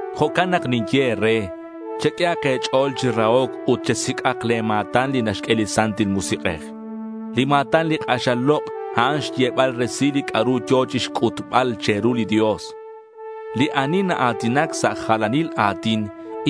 Jo'can nak ninye e̱re, cheq'uehak e̱ch'o̱l chi rahoc ut chesic'ak le̱ ma̱tan li naxq'ue li Santil Musik'ej. Li ma̱tan li k'axal lok', a'an xyebal resil li c'a'ru yo̱ chi xc'utbal che̱ru li Dios. Li ani naa̱tinac sa' jalanil a̱tin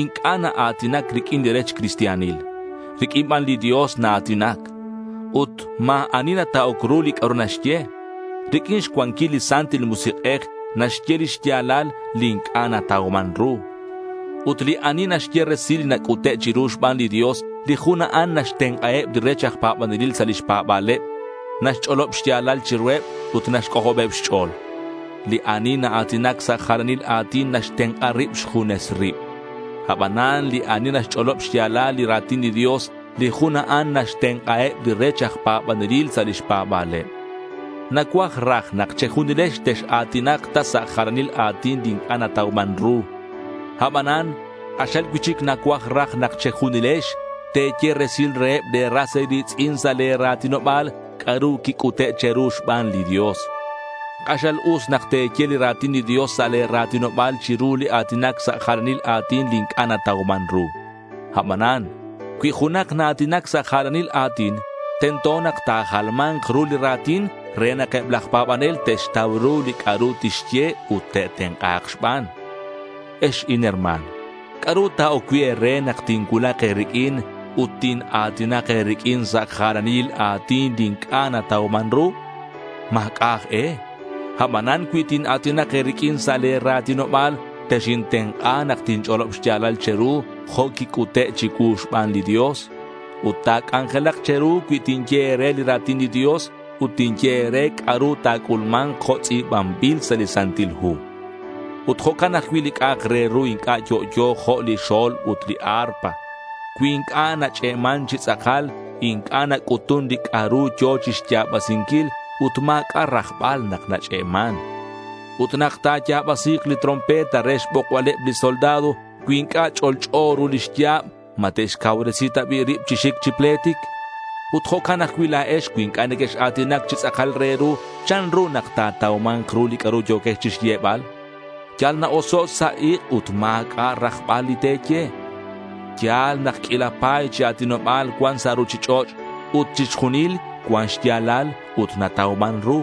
inc'a' naa̱tinac riq'uin li rech cristianil. Riq'uin ban li Dios naa̱tinac. Ut ma̱ ani nata'oc ru li c'a'ru naxye. Riq'uin xcuanquil li Santil Musik'ej naxye li xya̱lal li inc'a' natauman ru. Ut li ani naxye resil li nac'ute' chiru xban li Dios, li jun a'an naxtenk'aheb li rech aj pa̱banelil sa' lix pa̱ba̱leb. Naxch'olob xya̱lal chiruheb ut naxc'ojobeb xch'o̱l. Li ani naa̱tinac sa' jalanil a̱tin naxtenk'a rib xjunes rib. Abanan li ani naxch'olob xya̱lal li ra̱tin li Dios, li jun a'an naxtenk'aheb li rech aj pa̱banelil sa' lix pa̱ba̱leb. Nacuaj raj nak che̱junilex tex-a̱tinak ta sa' jalanil a̱tin li inc'a' natauman ru. Abanan k'axal cui'chic nacuaj raj nak che̱junilex te̱ye resil reheb le̱ ras e̱ri̱tz'in sa' le̱ ra̱tinoba̱l c'a'ru quic'ute' che̱ru xban li Dios. K'axal us nak te̱ye li ra̱tin li Dios sa' le̱ ra̱tinoba̱l chiru li a̱tinac sa' jalanil a̱tin li inc'a' natauman ru. Abanan cui junak naa̱tinac sa' jalanil a̱tin, tento nak ta̱jalma̱nk ru li ra̱tin re nak eb laj pa̱banel te'xtau ru li c'a'ru tixye ut te'tenk'a̱k xban. Ex inherma̱n, ¿c'a'ru ta̱oc cui' e̱re nak tincuulak e̱riq'uin ut tina̱tinak e̱riq'uin sa' jalanil a̱tin li inc'a' natauman ru? Ma̱c'a' aj e. Abanan cui tina̱tinak e̱riq'uin sa' le̱ ra̱tinoba̱l, texintenk'a nak tinch'olob xya̱lal che̱ru jo' quic'ute' chicuu xban li Dios. Ut ta̱c'anjelak che̱ru cui tinye e̱re li ra̱tin li Dios ut tinye e̱re c'a'ru ta̱c'ulma̱nk jo' tz'i̱banbil sa' li Santil Hu. Ut jo'can ajcui' li c'a'ak re ru inc'a' yo'yo jo' li xo̱lb ut li arpa. Cui inc'a' nach'e'man chi tz'akal inc'a' nac'utun li c'a'ru yo̱ chixya̱basinquil ut ma̱c'a' rajbal nak nach'e'man. Ut nak ta̱ya̱basi̱k li trompeta re xbokbaleb li soldado, cui inc'a' ch'olch'o ru lix ya̱b, ¿ma te'xcauresi ta bi' rib chi xic chi pletic? Ut jo'can ajcui' la̱ex cui inc'a' nequex-a̱tinac chi tz'akal re ru, ¿chanru nak ta̱tauma̱nk ru li c'a'ru yo̱quex chixyebal? Yal na-oso' sa' ik' ut ma̱c'a' rajbal li te̱ye. Ya̱l nak q'uila pa̱y chi a̱tinoba̱l cuan sa' ruchich'och' ut chixjunil cuan xya̱lal ut natauman ru.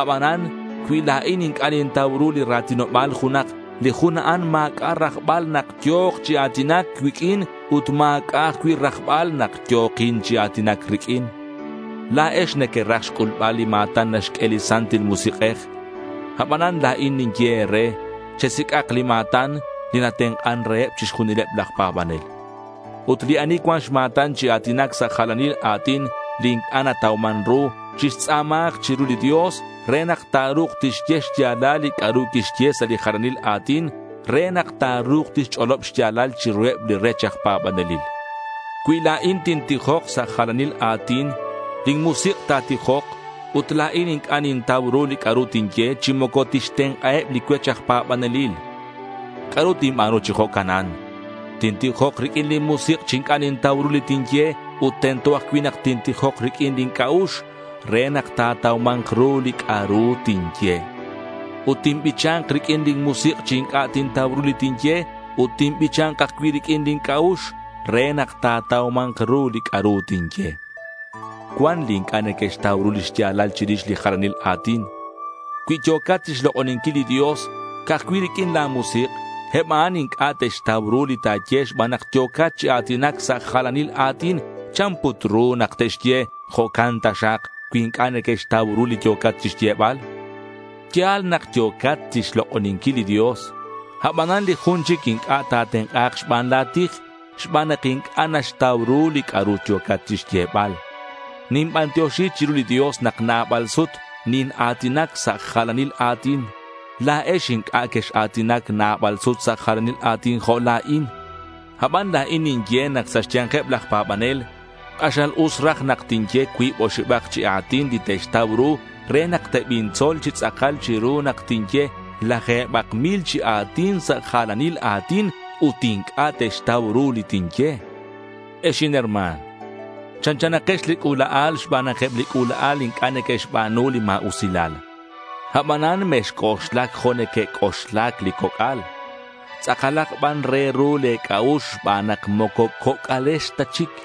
Abanan cui la̱in inc'a' nintau ru li ra̱tinoba̱l junak, li jun a'an ma̱c'a' rajbal nak yo̱k chi a̱tinac cuiq'uin ut ma̱c'a' ajcui' rajbal nak yo̱kin chi a̱tinac riq'uin. La̱ex nequeraj xc'ulbal li ma̱tan naxq'ue li Santil Musik'ej. Abanan la̱in ninye e̱re chesic'ak li ma̱tan li natenk'an reheb chixjunileb laj pa̱banel. Ut li ani cuan xma̱tan chi a̱tinac sa' jalanil a̱tin, li inc'a' natauman ru, chixtz'a̱mahak chiru li Dios re nak ta̱ru̱k tixye xya̱lal li c'a'ru quixye sa' li jalanil a̱tin re nak ta̱ru̱k tixch'olob xya̱lal chiruheb li rech aj pa̱banelil. Cui la̱in tintijok sa' jalanil a̱tin lin musik' ta̱tijok ut la̱in inc'a' nintau ru li c'a'ru tinye chi moco tixtenk'aheb li cuech aj pa̱banelil. ¿C'a'ru tinba̱nu chi jo'canan? Tintijok riq'uin lin musik' chi inc'a' tintau ru li tinye ut tento ajcui' nak tintijok riq'uin lin c'a'ux re nak ta̱tauma̱nk ru li c'a'ru tinye. Ut tinbicha̱nk riq'uin lin musik' chi inc'a' tintau ru li tinye ut tinbicha̱nk ajcui' riq'uin lin c'a'ux re nak ta̱tauma̱nk ru li c'a'ru tinye. Cuan li inc'a' neque'xtau ru li xya̱lal chirix li jalanil a̱tin. Cui yo̱cat chixlok'oninquil li Dios ca'aj cui' riq'uin la̱ musik', eb a'an inc'a' te'xtau ru li ta̱ye xban nak yo̱cat chi a̱tinac sa' jalanil a̱tin. ¿Chan put ru nak te'xye “jo'can taxak” cui inc'a' neque'xtau ru li yo̱cat chixyebal? Ya̱l nak yo̱cat chixlok'oninquil li Dios, abanan li jun chic inc'a' ta̱tenk'a̱k xban la̱ tij xban nak inc'a' naxtau ru li c'a'ru yo̱cat chixyebal. Ninbantioxi chiru li Dios nak nabal sut nina̱tinac sa' jalanil a̱tin. La̱ex inc'a' quex-a̱tinac nabal sut sa' jalanil a̱tin jo' la̱in. Aban la̱in ninye nak sa' xya̱nkeb laj pa̱banel k'axal us raj nak tinye cuib oxibak chi a̱tin li te'xtau ru re nak tebintzol chi tz'akal chiru nak tinye laje̱bak mil chi a̱tin sa' jalanil a̱tin ut inc'a' te'xtau ru li tinye. Ex inherma̱n, chanchanakex li c'ula'al xban nak eb li c'ula'al inc'a' neque'xba̱nu li ma̱usilal. Abanan mexc'oxlac jo' neque'c'oxlac li coc'al. Tz'akalak ban re ru le̱ c'a'ux xban nak moco coc'alex ta chic.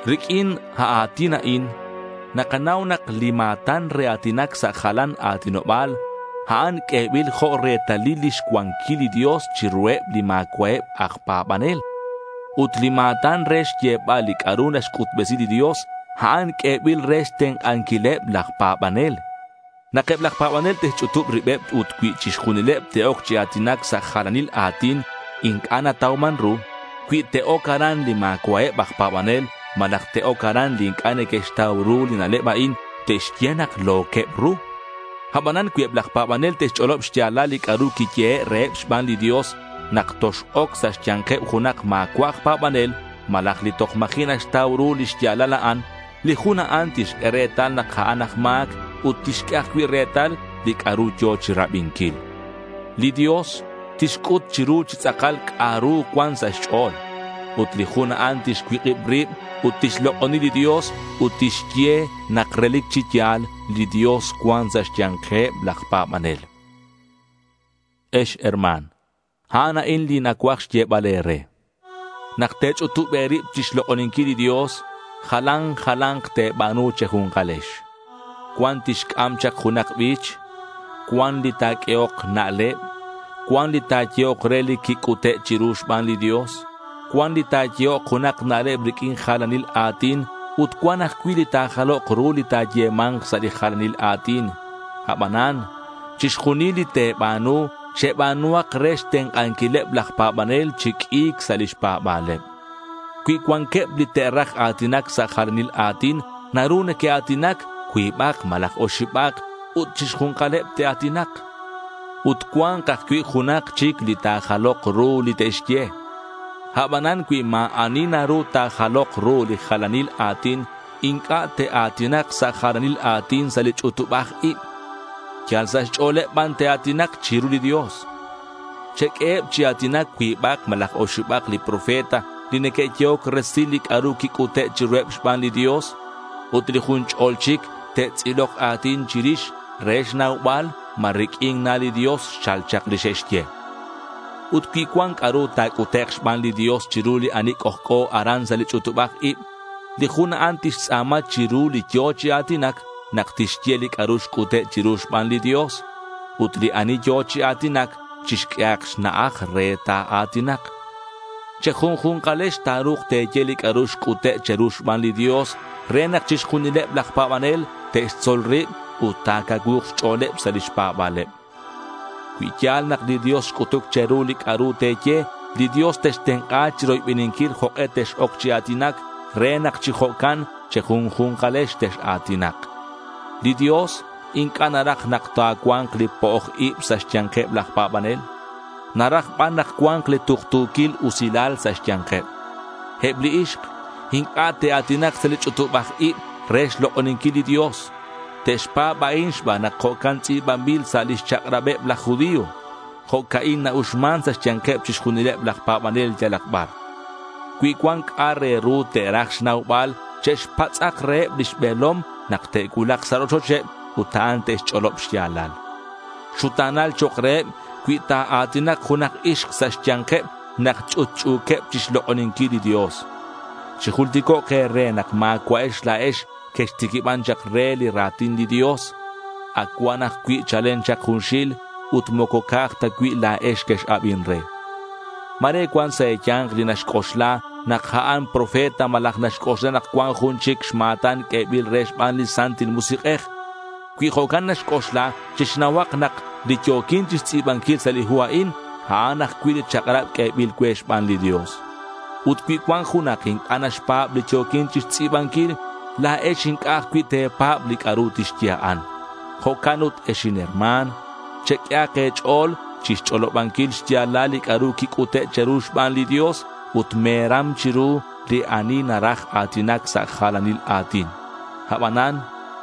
Riq'uin a a̱tin a'in nakanau nak li ma̱tan re a̱tinac sa' jalan a̱tinoba̱l, a'an q'uebil jo' retalil lix cuanquilal li Dios chiruheb li ma̱cua'eb aj pa̱banel. Ut li ma̱tan re xyebal li c'a'ru naxc'utbesi li Dios, a'an q'uebil re xtenk'anquileb laj pa̱banel. Nak eb laj pa̱banel te'xch'utub ribeb ut cui chixjunileb te'oc chi a̱tinac sa' jalan a̱tin inc'a' natauman ru, cui te'oc aran li ma̱cua'eb aj pa̱banel malaj te'oc aran li inc'a' neque'xtau ru li na'leb a'in, te'xye nak lo̱queb ru. Abanan cui eb laj pa̱banel te'xch'olob xya̱lal li c'a'ru quiyehe' reheb xban li Dios, nak tox-oc sa' xya̱nkeb junak ma̱cua' aj pa̱banel malaj li toj ma̱ji' naxtau ru li xya̱lal a'an, li jun a'an tixq'ue retal nak a'an aj ma̱c ut tixq'ue ajcui' retal li c'a'ru yo̱ chirabinquil. Li Dios tixc'ut chiru chi tz'akal c'a'ru cuan sa' xch'o̱l. Ut li jun a'an tixcuik'ib rib ut tixlok'oni li Dios ut tixye nak relic chi ya̱l li Dios cuan sa' xya̱nkeb laj pa̱banel. Ex herma̱n, a'an a'in li nacuaj xyebal e̱re. Nak te̱ch'utub e̱rib chixlok'oninquil li Dios, jalan jala̱nk te̱ba̱nu che̱ju̱nkalex. Cuan tixc'am chak junak bich; cuan li ta̱q'uehok na'leb; cuan li ta̱yehok re li quic'ute' chiru xban li Dios; cuan li ta̱yehok junak na'leb riq'uin jalanil a̱tin ut cuan ajcui' li ta̱jalok ru li ta̱yema̱nk sa' li jalanil a̱tin. Abanan chixjunil li te̱ba̱nu, cheba̱nuhak re xtenk'anquileb laj pa̱banel chi q'ui̱c sa' lix pa̱ba̱leb. Cui cuanqueb li te'raj a̱tinac sa' jalanil a̱tin, naru neque'a̱tinac cuibak malaj oxibak ut chixju̱nkaleb te'a̱tinak. Ut cua̱nk ajcui' junak chic li ta̱jalok ru li te'xye. Abanan cui ma̱ ani naru ta̱jalok ru li jalanil a̱tin, inc'a' te'a̱tinak sa' jalanil a̱tin sa' li ch'utubaj ib. Yal sa' xch'o̱leb ban te'a̱tinak chiru li Dios. Cheq'ueheb chi a̱tinac cuibak malaj oxibak li profeta li neque'yehoc resil li c'a'ru quic'ute' chiruheb xban li Dios, ut li jun ch'ol chic te'tz'ilok a̱tin chirix re xnaubal ma riq'uin na li Dios xchal chak li xe'xye. Ut cui cuan c'a'ru ta̱c'utek' xban li Dios chiru li ani c'ojc'o aran sa' li ch'utubaj ib, li jun a'an tixtz'a̱ma chiru li yo̱ chi a̱tinac nak tixye li c'a'ru xc'ute' chiru xban li Dios. Ut li ani yo̱ chi a̱tinac chixq'uehak xna'aj re ta̱a̱tinak. Che̱junju̱nkalex ta̱ru̱k te̱ye li c'a'ru xc'ute' che̱ru xban li Dios re nak chixjunileb laj pa̱banel te'xtzol rib ut ta̱cacuu̱k xch'o̱leb sa' lix pa̱ba̱leb. Cui ya̱l nak li Dios xc'utuc che̱ru li c'a'ru te̱ye, li Dios textenk'a chiroybeninquil jok'e tex-oc chi a̱tinac re nak chi jo'can che̱junju̱nkalex tex-a̱tinak. Li Dios inc'a' naraj nak ta̱cua̱nk li po'oj ib sa' xya̱nkeb laj pa̱banel. Naraj ban nak cua̱nk li tuktu̱quil usilal sa' xya̱nkeb. Eb li ixk inc'a' te'a̱tinak sa' li ch'utubaj ib re xlok'oninquil li Dios. Te'xpa̱b a'in xban nak jo'can tz'i̱banbil sa' lix chak'rabeb laj judío. Jo'ca'in na-uxman sa' xya̱nkeb chixjunileb laj pa̱banel yalak bar. Cui cuan c'a' re ru te'raj xnaubal che'xpatz'ak reheb lix be̱lom nak te'cuulak sa' rochocheb ut a'an tixch'olob xya̱lal. Xuta̱nal chok' reheb cui ta̱a̱tinak junak ixk sa' xya̱nkeb nak ch'utch'u̱queb chixlok'oninquil li Dios. Chijulticok' e̱re nak ma̱cua'ex la̱ex quextiquiban chak re li ra̱tin li Dios. Ac cuan ajcui' chalen chak junxil. Ut moco ca'aj cui' ta la̱ex quex-abin re. Ma̱re cuan sa' e̱ya̱nk li naxc'oxla nak a'an profeta malaj naxc'oxla nak cuan jun chic xma̱tan q'uebil re xban li Santil Musik'ej. Cui jo'can naxc'oxla, chixnauhak nak li yo̱quin chixtz'i̱banquil sa' li hu a'in, a'an ajcui' li chak'rab q'uebil cue xban li Dios. Ut cui cuan junak inc'a' naxpa̱b li yo̱quin chixtz'i̱banquil, la̱ex inc'a' ajcui' te̱pa̱b li c'a'ru tixye a'an. Jo'can ut ex inherma̱n, cheq'uehak e̱ch'o̱l chixch'olobanquil xya̱lal li c'a'ru quic'ute' che̱ru xban li Dios ut me̱ram chiru li ani naraj a̱tinac sa' jalanil a̱tin. Abanan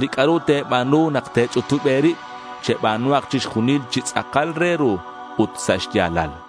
li c'a'ru te̱ba̱nu nak te̱ch'utub e̱rib, cheba̱nuhak chixjunil chi tz'akal re ru ut sa' xya̱lal.